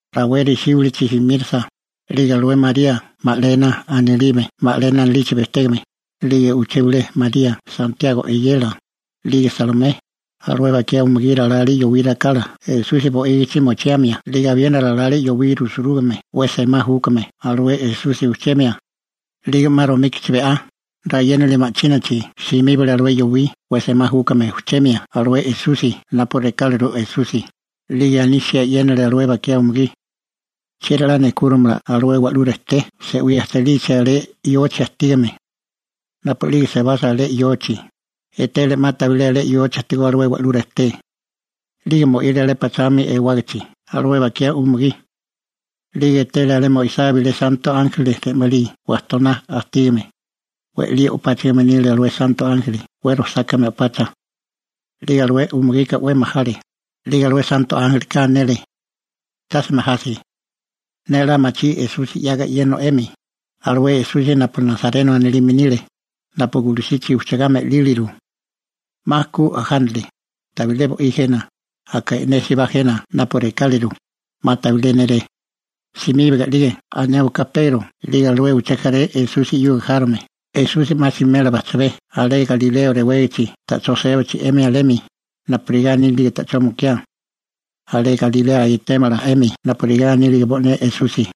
Rawé resíbilichi simírasa, a'lige alué María Magalena anilime, 'lige uché bilé María Santiago (Akobo) eyela, 'lige Salomé, alué bakiá umugí ralale yowí rakala Esusi bo'ígichi mochiamia 'lige abiena ralale yowí rusurúgame 'we semá júkame alué Esusi ujchemia. 'Lige 'ma romíkichi, be'á rayénali ma'chínachi, simíbale alué yowí 'we semá júkame ujchemia alué Esusi napu rekáliru Esusi, 'lige anisia e'yénale alué bakiá umugí: ―¿Chieri 'la nejkúrimala alué wa'lú rejté se'wí ajchalichi alé yochi ajtígame? Napu'lige sebasa alé yochi a'bemi, etele 'ma tabilé alé yochi ajtigó alué wa'lú rejté. 'Lige mo'ile alé pachami ewarágichi alué bakiá umugí. 'Lige etele alé mo'isá bilé santo ánjeli re'malí wajtoná ajtígame. We'lí o'páchigime nile alué santo ánjeli 'we rojsákame o'pacha. 'Lige alué umugika 'we majale, 'lige alué santo ánjelika anele: ―Tase majasi. Ne 'la machí Esusi 'yaga e'yéneo 'emi, alué Esusi napu Nasareno anilime nile, napu gulusichi ujchagá me'líliru. 'Ma ku ajánale, tabilé bo'í jena, aka e'nésibá jena napu rekáliru, 'ma tabilé néré. Simíbaga 'lige anéwaká Pegro 'lige alué uché jaré Esusi 'yuga járome, Esusi 'ma simela bajchabé alé Galilea rewégichi ta'chó sébachi 'emi alemi, napurigá anílige ta'chó mukiá. Alé Galilea etémala 'emi napurigá anílige bo'né Esusi.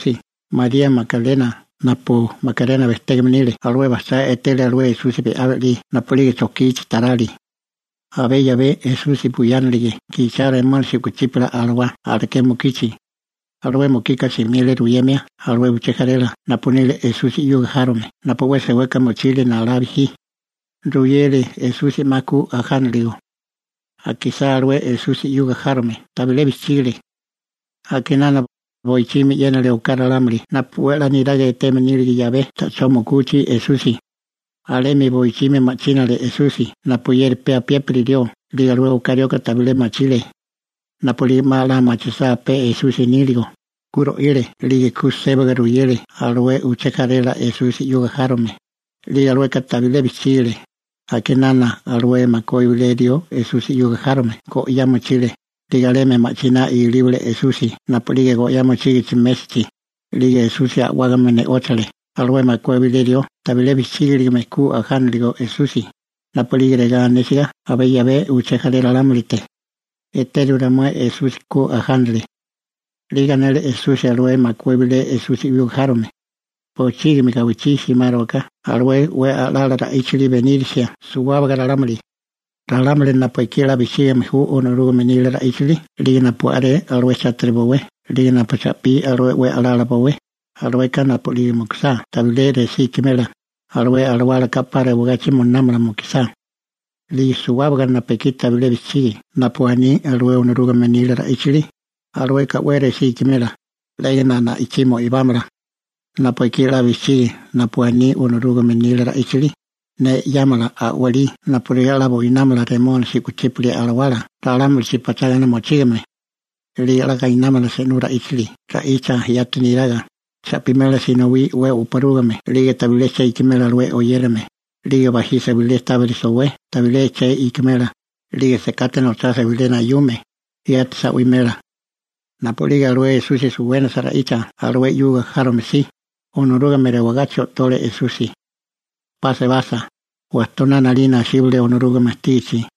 Napu'lige ku ajánasa Esusi, María Magalena napu Magalena bejtégame nile, alué bajchá etele alué Esusi be'á be'lí napu'lige chojkichi tarali (romíkichi). Abé 'yabé Esusi buyánilige gichao remónisi u'kuchípala alawá alaké mukichi. Alué mukika simile ruyemia alué uché jarela napu nile Esusi 'yuga járome napu 'we seweka mochile nalá bijí. Ruyele Esusi 'ma ku ajánaligo. Akisá alué Esusi 'yuga járome, tabilé bijchígale. A'kinana, boichimi e'yénale oká ralámuli napu 'we a'lá niraga eteme nílige 'yabé ta'chó mukuchi Esusi. Alemi boichimi ma'chínale Esusi napuyeri pe apiépiri rió 'lige alué oká rioka tabilé machile. Napu'lige 'ma 'la machisá pe Esusi níligo, ku ro'ile 'lige ku sébaga ruyele alué uché jarela Esusi 'yuga járome, 'lige alueka tabilé bijchígale. A'kinana alué makué bilé rió Esusi 'yuga járome go'yá mochile, 'lige alemi ma'chiná ilíbale Esusi napu'lige go'yá mochígichi mésachi. 'Lige Esusi a'wágame ne'óchale alué makué bilé rió tabilé bijchígiligame ku ajániligo Esusi, napu'lige regá anésiga abé 'yabé uché jaré ralámulite: «Eteru ramué Esusi, ku ajánale.» 'Lige anele Esusi alué makué bilé Esusi 'yuga járome: ―Bochígimi gawichí simárowaká alué 'we a'lala ra'íchili benírisia suwábaga ralámuli. Ralámuli napu ekí 'la bijchígame ju Onorúgame nila ra'íchili 'lige napu a'ré alué chátiri bowé 'lige napu cha'pí alué 'we a'lala bowé, alueka napu'lige mukusá tabilé resí ikimela, alué alawálaka 'pa rewagachi moinámala mukusá. 'Lige suwábaga napu ekí tabilé bijchigi napu aní alué Onorúgame nila ra'íchili, alueka 'we resí ikimela, 'légana na'ichí mo'ibámala. Napu ekí 'la bijchigi napu aní Onorúgame nila ra'íchili, ne 'yámala a'walí napurigá 'la buinámala remónisi u'kuchípala alawala ralámulichi pachágana mochígame. 'Lige 'la gainámala se'nú ra'íchili ra'icha yati neraga, cha'pimela sinowí 'we oporúgime 'lige tabilé che ikimela alué oyérame, 'lige bajisa bilé tábiri sowé tabilé che ikimela, 'lige sekate nochasa bilé nayume, yati sa'wimela. Napu'lige alué Esusi suwénasa ra'icha alué 'yuga járome si, Onorúgame rewagachi o'tole Esusi. Alé sebasa, wajtoná asíbale Onorúgame ajtígichi.